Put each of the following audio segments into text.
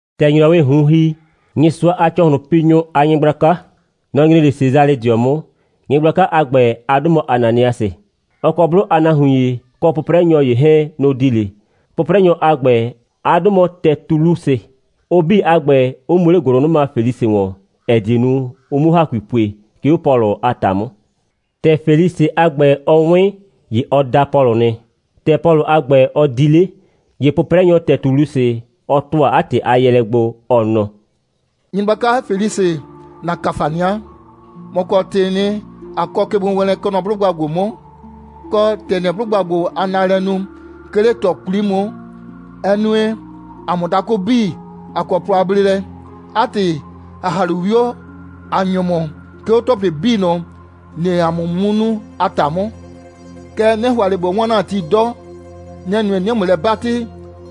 ‑Tɛ ‑nyrɔwɩɩ ꞊hun ‑hi, Nyɩsʋa a ‑cɔhlʋnpinyʋ a nyɩgblaka, nɔ‑ nyre 'le Sesalɩdɩɔ 'mʋ. Nyɩgblaka a ‑gbɛ, 'a 'dʋ mɔ Ananiasɩ. Ɔ kɔ 'blʋ a nahuin ‑ye, kɔ 'pʋprɛnyɔ ‑ye 'hɛɛn, nʋ‑ di 'le. 'Pʋprɛnyɔ a ‑gbɛ, 'a 'dʋ mɔ Tɛtulusɩ; ʋ 'bii a ‑gbɛ, 'ʋ mu 'le ‑gʋlʋnʋma Felisɩ ‑wɔn, ‑ɛ die nu, ʋ 'muo ‑hakui pue, 'ke 'o Pɔlʋ a ‑ta 'mʋ. ‑Tɛ Felisɩ a ‑gbɛ, ɔ 'wɩn, ‑ye ɔ da Pɔlʋ nɩ. ‑Tɛ Pɔlʋ a ‑gbɛ, ɔ di 'le, ‑ye 'pʋprɛnyɔ Tɛtulusɩ, ɔ ‑tʋa 'a ‑tɩ a yɛɛlɛ gbo, ɔ nɔ: «Nyɩgblaka Felisɩ, ‑na ‑kafania. ‑Mɔ kɔ ‑tɩɩ nɩ, ꞊a kɔ kegbowɛɛnlɛ, kɛ nɔ 'blʋgba ‑gbo 'mʋ, kɔ, ‑tɛ ‑nɩɩ 'blʋgba ‑gbo a naalɛ nu, 'ke 'le ꞊tɔ 'kwli 'mʋ, ɛ nue, ‑a mʋ dakʋ 'bii, ꞊a kɔ plɔ a bleelɛ. 'A ‑tɩ, ‑a ‑ha 'le 'wio, ꞊a ‑nyo ‑mʋ, 'ke 'o ‑tɔplɩ 'bii ꞊nʋ, ‑nɩɩ ‑a mʋ 'mʋ nu a ‑ta 'mʋ. Kɛɛ, 'nɩ ‑hʋa ꞊le ꞊bo 'waan ‑na ti 'dɔ. Nɛ‑ nue, 'nɩɩ ‑mʋ lɛ 'batɩ,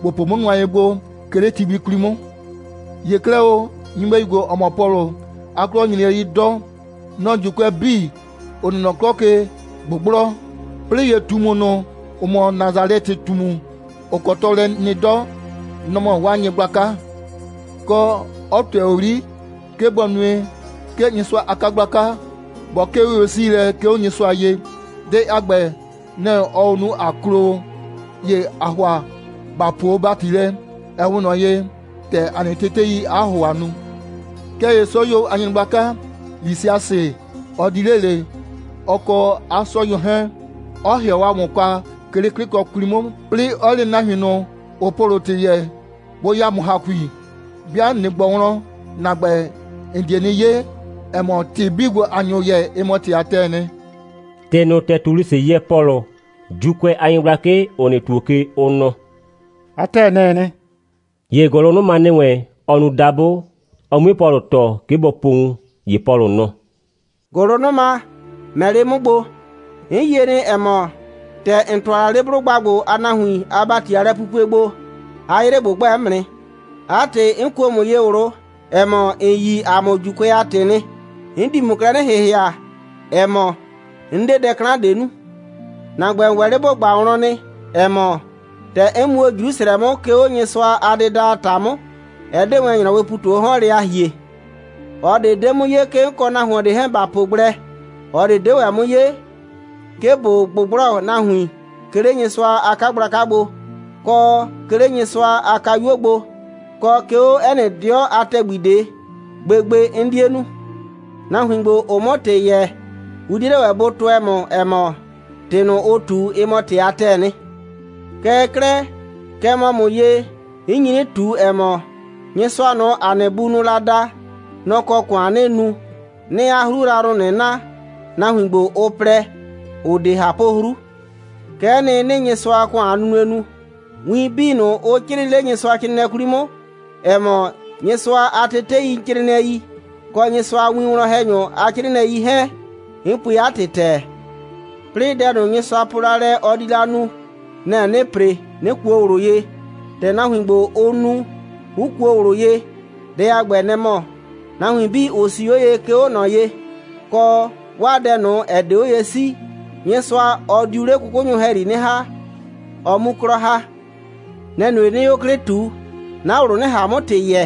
‑bo po 'mʋ nʋa ye gbo, 'ke 'le ti gbi 'kwli 'mʋ. ‑Ye 'klɛɛ o, nyɩbɛyu ‑gbo, ‑ɔ mɔ Pɔlʋ, 'a 'klɔ nyre lɛ 'yi 'dɔ. Nɔ‑ɔ ‑Juukʋɛ 'bii, ‑ʋ nɩ nɔ 'klɔ ke ꞊gbʋgblɔ. 'Plɩɩ ‑ye ꞊tumu ꞊nʋ, ‑ʋ mɔ Nasalɛtɩ꞊tumu, ‑ʋ kɔ tɔɔlɛ nɩ 'dɔ, nɔ‑ mɔ 'waa nyɩgblaka; kɔ, 'ɔ ꞊tʋɛ 'yri, 'ke bɔ nue, 'ke Nyɩsʋa a 'kagblaka bɔ 'kee 'oye'siilɛ, 'ke 'o Nyɩsʋa ye. Dɛ a ‑gbɛ, nɛ‑ ɔɔ o nu, ꞊a klo o. [‑Ye ‑aa ‑hʋa ‑ba puo o ‑bati lɛ, ‑ɛ 'we ꞊nɔ ye, ‑tɛ ‑a nɩ teteii 'a ‑hʋhʋa nu. Kɛɛ ‑ye 'sɔyuo a nyɩgblaka Lisiasɩ, ɔ di 'le ꞊le, ɔ kɔ 'a 'sɔyuo 'hɛɛn, 'ɔ ‑hɩɔ ‑a mʋ kwa, 'ke 'le 'klɩkɔ 'kwli 'mʋ, 'plɩɩ 'ɔ le nahuin ꞊nʋ, ‑ʋʋ Pɔlʋ ‑tɩ yɛɛ, bʋ ya ‑mʋ ‑hakui.] 'Bɩa ꞊nɩ ꞊gbɔ wlɔn, ‑na ‑gbɛ, ‑n die 'nɩ 'ye, ‑ɛ mɔ, ‑tɩ 'bii ‑gbo, ‑a nyo yɛɛ, ɩ mɔ ‑tɩ a ‑tɛɛ nɩ.» ‑Tɩ ꞊nʋ, Tɛtulusɩ yɛɛ Pɔlʋ, ‑Juukʋɛ a nyɩgblakɩ, ‑ʋ nɩ ‑tuo ke, ʋ nɔ: «'A ‑tɛɛ, nɛ‑ɛ nɩ.» ‑Ye ‑gʋlʋnʋma ‑nɩ wɛn, ɔ nu dabʋ, ɔ 'mue Pɔlʋ tɔɔ, 'ke bɔ po wun. ‑Ye Pɔlʋ nɔ: «‑Gʋlʋnʋma, ‑mɛ 'le 'mʋ gbo. 'N yie nɩ, ‑ɛ mɔ, ‑tɛ ‑n ‑tʋa la 'le 'blʋgba ‑gbo a nahuin a ‑bati a lɛpupue gbo, 'a 'yrɩ ꞊gbʋgbɛ 'mʋ nɩ. 'A ‑tɩ, 'n kuo ‑mʋ ye ꞊wlʋ, ‑ɛ mɔ, ‑n yi ‑a mʋ ‑Juukʋɛ a ‑tɩ nɩ. 'N di ‑mʋ klɛ 'nɩ ‑hɩhɩa, ‑ɛ mɔ, 'n 'de dɛ 'klan ꞊de nu. ‑Na ‑gbɛ, ‑n ‑wɛ 'le ‑bo ꞊gba wlɔn nɩ, ‑ɛ mɔ, ‑tɛ 'n mu o Jrusrɛ 'mʋ, 'ke 'o Nyɩsʋa a dɩda a ‑ta 'mʋ, ɛ 'de wɛn ‑nyrɔwɩɩ ‑pu ꞊tu 'o 'hɔn lɛ a ‑hie. ꞊Ɔ ꞊de 'de 'mʋ 'ye, 'ke 'n kɔ nahuon ꞊de 'hɛɛn ‑ba po gblɛ. ꞊Ɔ ꞊de 'de ‑wɛ 'mʋ 'ye, 'ke ꞊bo ꞊gbʋgblɔ nahuin, 'ke 'le Nyɩsʋa a 'kagblaka gbo, kɔ, 'ke 'le Nyɩsʋa a kayuo gbo, kɔ, 'ke 'o 'ɛ nɩ 'dɩɔ a ‑tɛgbi ꞊de. Gbegbe 'n 'die nu. Nahuin ‑gbo, ‑ʋʋ 'mʋ ‑tɩ yɛɛ, ʋ 'die 'le ‑wɛ bʋ tʋɛ ‑mʋ, ‑ɛ mɔ, ‑tɩ ꞊nʋ, ʋʋ ꞊tu, ɩ mɔ ‑tɩ a ‑tɛɛ nɩ. Kɛɛ 'klɛɛ, kɛ mɔ ‑mʋ ye, 'n nyi 'nɩ ꞊tu, ‑ɛ mɔ, Nyɩsʋa ꞊nʋ, ‑a nɩ bunʋʋ la da, nɔ‑ kɔ ‑kʋan 'nɩɩ nu, 'nɩɩ 'a 'hru yrayrʋ ꞊nʋ na, nahuin ‑gbo, ʋ plɛ, ‑ʋ 'de ꞊hapʋ'hru. Kɛ'ɛ nɩ, 'nɩɩ Nyɩsʋa a ‑kʋan a nunue nu. Win 'bii ꞊nʋ, ʋ 'crɩɩ 'le Nyɩsʋacrɩɩnɩɛ 'kwli 'mʋ, ‑ɛ mɔ, Nyɩsʋa a teteicrɩɩnɩɛi, kɔ Nyɩsʋa a winwlɔn‑hɛnyʋ a 'crɩɩnɩɛi 'hɛɛn, 'n pue 'a ‑tɩ ‑tɛɛ. 'Plɩɩ dɛ ꞊nʋ, Nyɩsʋa po la lɛ, ɔ di la nu, nɛ‑ 'nɩɩ ‑pre, 'nɩ kuo ꞊wlʋ ye, ‑tɛ nahuin ‑gbo, ʋ nu, 'ʋ kuo ꞊wlʋ ye. Dɛ a ‑gbɛ, nɛ‑ mɔ: nahuin 'bii, ‑ʋ 'sii 'o ye, 'ke 'o ꞊nɔ ye, kɔ 'waa dɛ ꞊nʋ, ‑ɛ 'de 'o ye 'sii, Nyɩsʋa, ɔ diu 'le 'kʋkʋnyʋ ‑hɛyri 'nɩ ‑ha, ɔ 'mu 'klɔ ‑ha. Nɛ‑ nue, 'nɩɩ 'o 'klɩ ꞊tu, 'na ꞊wlʋ 'nɩ ꞊han 'mʋ ‑tɩ yɛɛ,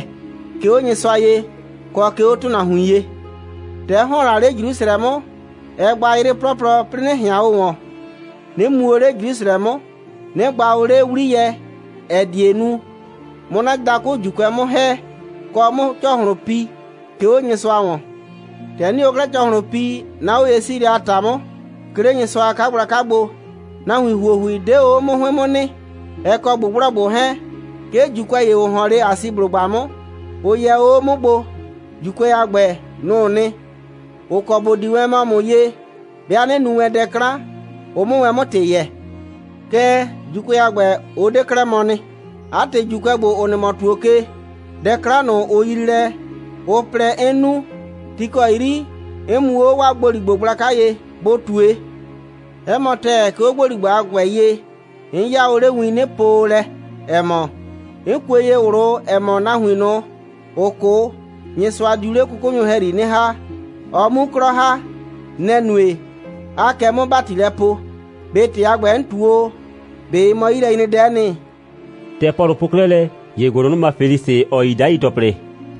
'ke 'o Nyɩsʋa ye, kɔ 'ke 'o ‑tʋnahuin ye. ‑Tɛ 'n ‑hɔn la 'le Jrusrɛ 'mʋ, ɛ gba 'yrɩ 'plɔplɔ, 'plɩɩ, 'nɩ ꞊hɩan o ‑wɔn, 'nɩ mu o 'le Jrusrɛ 'mʋ, 'nɩ gba o 'le 'wliyɛ, ‑ɛ die nu, 'mʋ 'na dakʋ ‑Juukʋɛ 'mʋ ‑hɛ, kɔ, 'mʋ ‑cɔhlʋn pi, 'ke 'o Nyɩsʋa ‑wɔn. ‑Tɛ 'nɩɩ o 'klɛɛ ‑cɔhlʋn pi, 'na 'oye'siilɛ a ‑ta 'mʋ, 'ke 'le Nyɩsʋa a 'kagblaka gbo, nahuin ‑huohui 'de o 'o 'mʋ 'hʋɩn 'mʋ nɩ, ɛ kɔ ꞊gbʋgblɔgbʋ 'hɛɛn, 'ke ‑Juukʋɛ ‑ye, ‑ʋ ‑hɔn 'le Asiblʋgba 'mʋ, ʋ yɛ o 'o 'mʋ gbo. ‑Juukʋɛ a ‑gbɛ, nʋ‑ʋ nɩ, ‑ʋ kɔ ‑bʋ di wɛn mɔ ‑mʋ ye, 'bɩa 'nɩ nu wɛn dɛ 'klan, ʋ 'mʋ wɛn 'mʋ ‑tɩ yɛɛ. Kɛɛ, ‑Juukʋɛ a ‑gbɛ, ʋ 'de 'klɛɛ mɔ nɩ. 'A ‑tɩ, ‑Juukʋɛ ‑gbo, ‑ʋ nɩ mɔ ‑tuo ke, dɛ 'klan ꞊nʋ, ʋ yrii lɛ, ʋ plɛ, 'n nu, ti ‑kɔ 'yri 'n mu o 'o 'waa ‑gboligbo gblaka ye, bʋ ꞊tue. 'Ɛ mɔ ‑tɛɛ, 'ke 'o ‑gboligbo a ‑gbɛ ye, 'nɩ 'yaa o 'le win, 'nɩ po o lɛ, ‑ɛ mɔ: 'N kue ye ꞊wlʋ, ‑ɛ mɔ, nahuin ꞊nʋ, ‑ʋ 'kʋ, Nyɩsʋa diu 'le 'kʋkʋnyʋ ‑hɛyri 'nɩ ‑ha, ʋ 'mu 'klɔ ‑ha. Nɛ‑ nue, 'aa kɛ 'mʋ ‑bati lɛ poo. ꞊Be ‑tɩ a ‑gbɛ, 'n ꞊tu o, ꞊be ɩ mɔ 'yilɛnyredɛ'ɛ nɩ?» ‑Tɛ Pɔlʋ po 'klɛɛ lɛ, ‑ye ‑gʋlʋnʋma Felisɩ, ‑ɔ yi 'dai ‑tɔplɩ,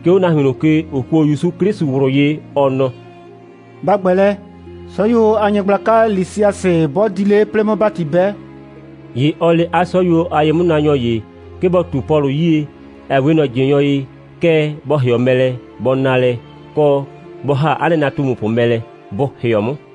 'ke 'o nahuin ꞊nʋ ke, ‑ʋ kuo ‑Yusu 'Klɩsʋ ꞊wlʋ ye, ɔ nɔ: «Ba ‑gbɛ lɛ. 'Sɔyuo a nyɩgblaka Lisiasɩ 'bɔ di 'le, 'plɩɩ 'mʋ ‑bati 'bɛ.» ‑Ye ɔ le 'a 'sɔyuo a ye'mʋnaanyɔ ‑ye, 'ke bɔ ꞊tu Pɔlʋ 'yie, ‑ɛ 'we ꞊nɔ ꞊jɩnyɔ ye, kɛɛ, bɔ ‑hɩɔ mɛ lɛ, bɔ na lɛ, kɔ, bɔ ‑ha 'a nɩnatumupʋ mɛ lɛ, bʋ ‑hɩɔ 'mʋ.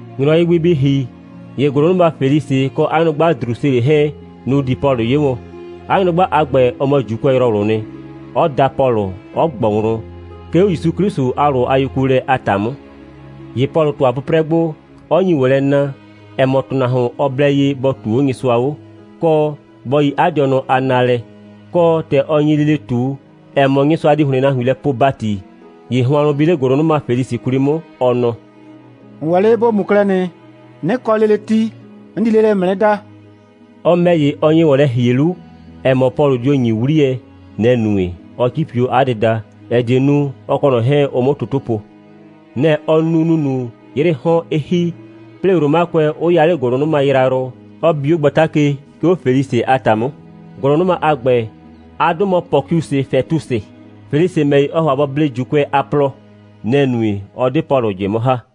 ‑Nyrɔwɩ gbi bɩ ‑hi, ‑ye ‑gʋlʋnʋma Felisɩ kɔ 'a nyrʋgba Drusilɩ 'hɛɛn, nʋ‑ di Pɔlʋ 'ye wɔn. 'A nyrʋgba a ‑gbɛ, ɔ mɔ ‑Juukʋɛyrɔwlʋʋ nɩ; 'ʋ da Pɔlʋ, 'ʋ ꞊gbɔ wlɔn, 'ke 'o ‑Yusu 'Klɩsʋ a ꞊wlʋ a yekuolɛ a ‑ta 'mʋ. ‑Ye Pɔlʋ ‑tʋa 'pʋprɛ gbo, 'ɔ nyi ‑wɔn lɛ na, ‑ɛ mɔ, ‑tʋnahuon, ɔ blɛ ye bɔ ꞊tuu 'o Nyɩsʋa 'o, kɔ, bɔ yi 'a dɩɔnʋ a naalɛ, kɔ, ‑tɛ ɔ nyi lele ꞊tu, ‑ɛ mɔ, Nyɩsʋa di ‑hlɩn nahuin lɛ poo ‑bati, ‑ye hʋannʋ bi 'le ‑gʋlʋnʋma Felisɩ 'kwli 'mʋ, ɔ nɔ: «‑N ‑wɛ 'le ‑bo mu 'klɛɛ nɩ. 'Nɩ kɔ lele ti, 'n di lele ‑mʋ 'nɩ da.» Ɔ ‑mɛ ‑ye, ɔ nye ‑wɔn lɛ ‑hie 'lu, ‑ɛ mɔ, Pɔlʋ dio ‑nyi 'wliyɛ. Nɛ‑ nue, 'ɔ 'cipi 'o 'a dɩda, ‑ɛ die nu, ɔ kɔ ꞊nɔ 'hɛɛn, ʋ 'mʋ toto po. Nɛ‑ ɔ nu ‑nunu, 'yrɩɩ 'hɔn 'ɩ ‑hi, 'plɩɩ Romakʋɛ 'ʋ ya 'le ‑gʋlʋnʋma yrayrʋ, 'ɔ bi 'o gbata ke, 'ke 'o Felisɩ a ‑ta 'mʋ. ‑Gʋlʋnʋma a ‑gbɛ, 'a 'dʋ mɔ Pɔkiusɩ Fɛtusɩ. Felisɩ ‑mɛ ‑ye, ɔɔ ‑hʋa bɔ blee ‑Juukʋɛ a plɔ. Nɛ‑ nue, 'ɔ 'de Pɔlʋ ꞊jɩ 'mʋ ‑ha.